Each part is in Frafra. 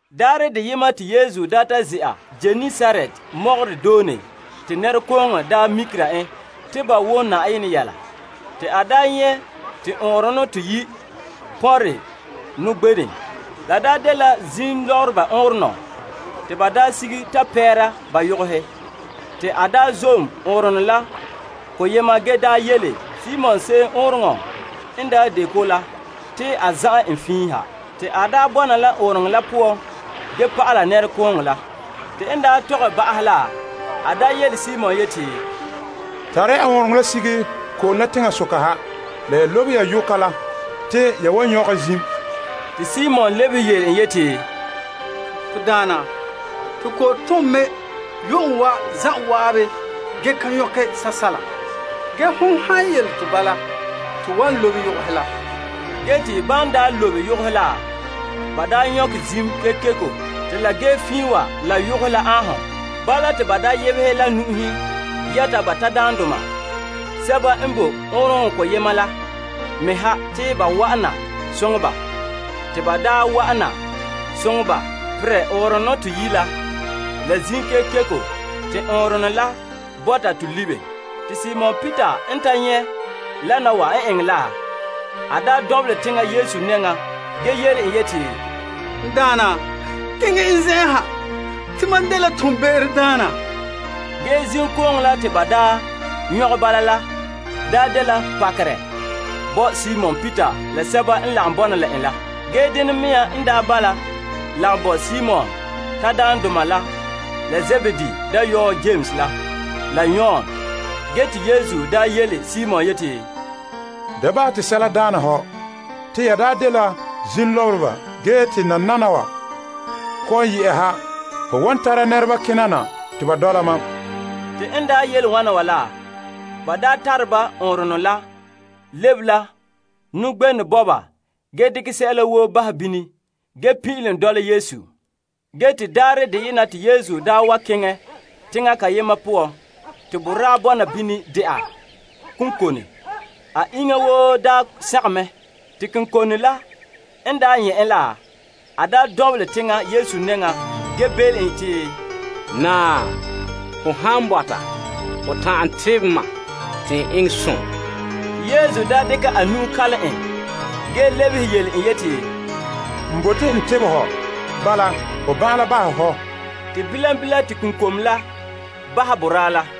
Daarɛ deyema te Yesu daa ta ze'a Genesaret mɔgɔrɛ doone te nɛrekooŋɔ mikera en te ba wom Na'ayenɛ yɛla. Te a nyɛ' te ɔɔnrɔnɔ toyi' pɔnre nɔgbenɛ. La dela zim lɔbereba ɔɔnrɔnɔ te ba sige ta pɛɛra ba yogohe. Te a zom ɔɔnrɔŋɔ la koyema ge yele Simon se'em ɔɔnrɔŋɔ n de ko la te a zaaɛ en fiin ha. Ge te a bɔna la ɔɔnrɔŋɔ la poan ge pa'alɛ nɛrekooŋɔ la. Te n ta tɔgɛ ba'ahɛ la, a yele Simon yeti, Tare ya ɔɔnrɔŋɔ la sige ko'om la teŋasoka ha la ya lobe ya yoka la te ya wan nyɔkɛ zim. Te Simon lebehe yele en yeti, To Daana, to kɔ'ɔn tom mɛ yu'uŋɔ wa zan'an ge ka nyɔkɛ sɛla. Ge hon han yele to bala, n wan lobe yogohe la. Ge te ban lobe yogohe la, ba nyɔgɛ zim kekeko ge te la ge fiin wa la yogohe la aanhom. Bala te ba yebehɛ la nu'uhen yɛta ba tadaandoma sɛba n boe ɔɔnrɔŋɔ koyema la me ha te ba wa'an na soŋɛ ba. Te ba wa'an na soŋɛ ba perɛ ɔɔnrɔnɔ toyi' la la zim kekeko ge te ɔɔnrɔnɔ la bɔta to libe. Te Simon Peter n ta nyɛ' wana wa n eŋɛ la, a dɔnbelɛ teŋa Yesu nɛŋa ge yele en yeti, N Daana, keŋɛ n zen'en ha te mam dela toonbe'erodaana. Ge zimkooŋɔ la te ba nyɔgɛ bala la de pakerɛ bo Simon Peter la sɛba n lagom bɔna la en la. Ge denɛ mea n bala lagom bo Simon tadaandoma la la Zebedee dayɔɔhe Yames la, la Yon. Ge te Yesu yele Simon yeti, Da bahɛ te sɛla daana hɔ. Te ya dela zimlɔbera ge te nananawa kɔ'ɔn yɛ'ɛha ho wan tara nɛreba kena na te ba dɔla mam. Te n yele wana wa la, ba tare ba ɔɔnrɔnɔ la lebe la nɔgbenɛ bɔba ge dekɛ sɛla woo bahɛ bini ge pin'ilom dɔla Yesu. Ge te daarɛ deyena te Yesu wa keŋɛ teŋa kayema poan te boraa bɔna bini dɛna konkone. A iŋa woo sagom mɛ. Te konkone la n nyɛ' en la, a dɔnbelɛ teŋa Yesu nɛŋa ge belem en te, Naa, ho han bɔta ho ta'an tebɛ mam te n eŋɛ som. Te Yesu dekɛ a nu'o kalam en ge lebehe yele en te, N bote n tebɛ hɔ. Bala ho ban'an la bahɛ hɔ. Te bilam bilam te konlom la bahɛ boraa la.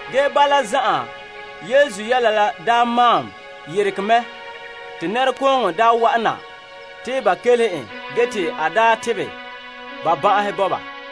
Ge bala zan'an Yesu yɛla la maan yeregɛ mɛ te nɛrekooŋɔ daa wa'an na te ba kelehe en ge te a tebɛ ba ban'ahe bo ba.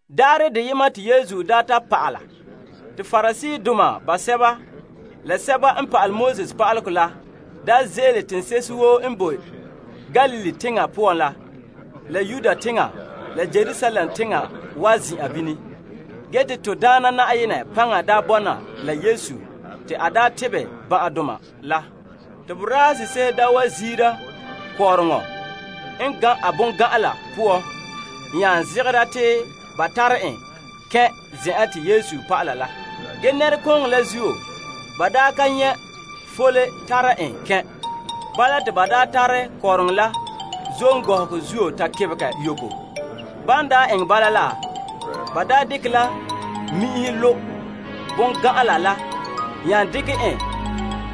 Daarɛ deyema te Yesu daa ta pa'ala. Te Pariseedoma basɛba la pa'alegɔ pa'aleba la ze'ele teŋse'ehe woo n boe Galilee teŋa poan na la, la Yudea teŋa, la Yerusalem teŋa wa zin'an bini. Ge te to Daana Na'ayenɛ paŋa daa bɔna la Yesu te a tebɛ ban'ahedoma la. Te borase'ehe wa ziira kɔɔrɔŋɔ n gan' a bongan'ala poan nya zegera te ba tare en kɛn' zen'an te Yesu pa'ala la. Ge nɛrekooŋɔ la zuo, ba ka nyɛ' fole tare en kɛn'. Bala te ba tare kɔɔrɔŋɔ la zom gɔhɔgɔ zuo ta kebegɛ yoko. Ba dekɛ la mi'inhe lo' bongan'ala nya dekɛ en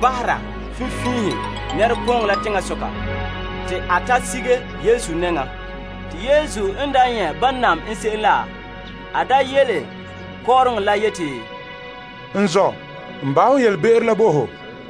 bahera finfiinhe nɛrekooŋɔ la teŋasoka te a ta sige Yesu nɛŋa. Te Yesu n nyɛ' ban nam n se'em la, a yele kɔɔrɔŋɔ la yeti, N zɔ', n bahɛ ho yelebe'ero la bo ho.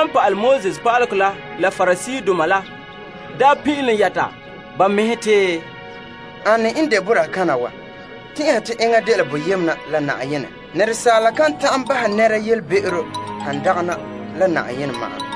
Pa'alegɔ pa'aleba la la Pariseedoma la pin'ilom yɛta ba mɛhe te, Ane n de boraa kana wa tɛn'ɛha te enŋa dela boyena la Na'ayenɛ? Nɛresaala kan ta'an bahɛ nɛra yelebe'ero han dagana la Na'ayenɛ ma'an.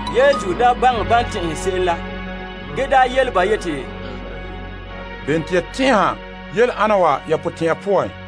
Yesu baŋɛ ban tɛn'ɛhe se'em la, ge soke ba yeti, Bene te ya tɛn'ɛha yele ana wa ya potɛn'ɛra poan?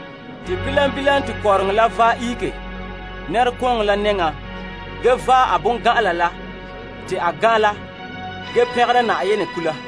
Te bilam bilam te kɔɔrɔŋɔ la vaɛ ihege nɛrekooŋɔ la nɛŋa ge vaɛ a bongan'ala la te a gan' la ge pɛngera Na'ayenɛ kula.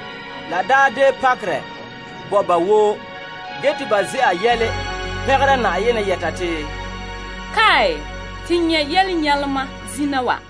La de pakerɛ bo ba woo, ge te ba ze'a yɛla pɛngera Na'ayenɛ yɛta te, to nyɛ' yelenyalema zina wa.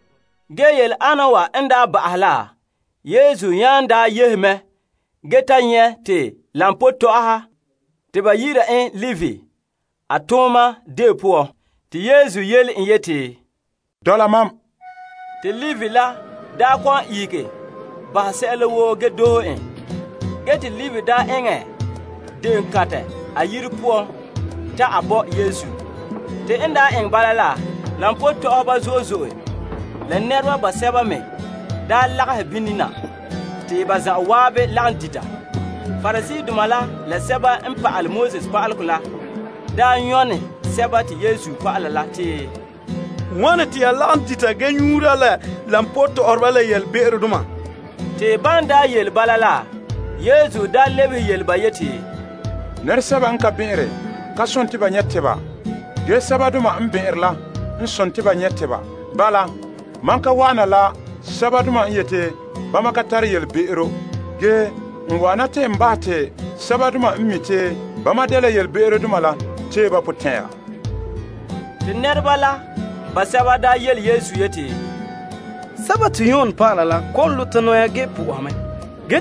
Ge yele ana wa n daa ba'ahɛ la, Yesu nya daa yehe mɛ ge ta nyɛ' koba tɔ'ɔha te ba yi'ira en Levi a tooma deo poan. Te Yesu yele en yeti, Dɔla mam. Te Levi ihege bahɛ sɛla woo ge doohe en. Ge te Levi daa eŋɛ de'eŋɔ kantɛ a yire poan ta a bo Yesu. Koba tɔ'ɔhɔba zo'e zo'e la nɛreba sɛba me lagahɛ bini na te ba zan'an lagom dita. Pariseedoma la la pa'alegɔ pa'aleba la daa nyɔne Yesu la a dɔlɔba la te, Wane te ya lagom dita ge nyuura la koba tɔ'ɔhɔba la yelebe'erodoma? Te ban yele bala la, Yesu lebehe yele ba yeti, Nɛresɛba n ka bɛn'ɛnre ka sontii ba nyɛ' tebedoma. Ge sɛbadoma n bɛn'ɛnre la n sontii te ba nyɛ' tebedoma. Bala, mam ka wa'ana la sɛbadoma n yete bama ka tare yelebe'ero, ge n wa'ana te n bahɛ te sɛbadoma n mi' te bama dela yelebe'erodoma la tee ba potɛn'ɛra. Te nɛreba la basɛba yele Yesu yeti, Yon dɔlɔba la kɔ'ɔn zagahɛ ba mɛhe ge po'oha mɛ, ge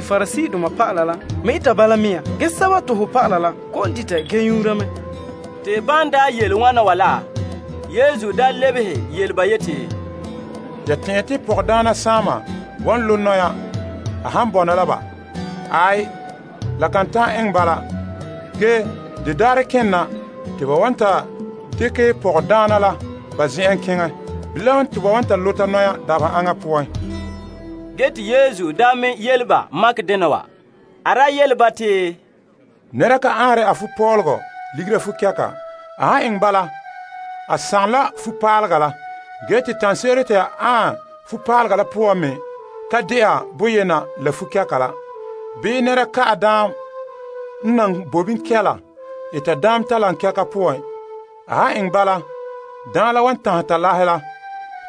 Pariseedoma dɔlɔba la me eta bala mea. Ge ho dɔlɔba la kɔ'ɔn dita ge nyuura mɛ. Te ban yele wana wa la, Yesu lebehe yele ba yeti, Ya tɛn'ɛhe te pɔgɔdaana saama wan zagahɛ ba mɛhe a han bɔna la ba? Aai, la kan ta'an eŋɛ bala. Ge de daarɛ kena te ba wan ta dekɛ pɔgɔdaana la ba zen'en keŋɛ. Bilam te ba wan ta zagahɛ ba mɛhe dabeha aŋa poan. Ge te Yesu me yele ba makɛ dena wa. A daa yele ba te, Nɛra ka anre a fupɔlɔgɔ ligera a fukɛka. A han eŋɛ bala, a sagom la a fupaalega la ge te tanɛ se'ere te a aɛn a fupaalega la poan me kan de'a boyena la fukɛka la. Bii nɛra ka'ɛ daam n nan boe bini kɛla eta daam talaŋkɛgɛhe poan. A han eŋɛ bala daam la wan tanhɛ talahe la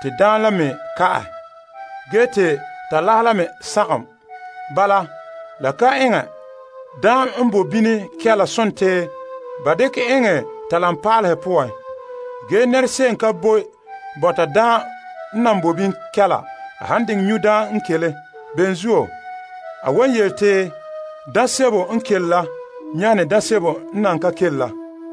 te daam la me ka'ahɛ ge te talahe la me sagom. Bala, la kan eŋɛ. Daam n boe bini kɛla sontii ba ka'ɛ enŋɛ daa talaŋpaalehe poan. Ge nɛra se'em ka boe bɔta daam n nan boe bini kɛla a han diŋɛ nyu' daam n kele. Bene zuo, a wan yele te daam sebo n kele la nyane daam sebo n nan ka kele la.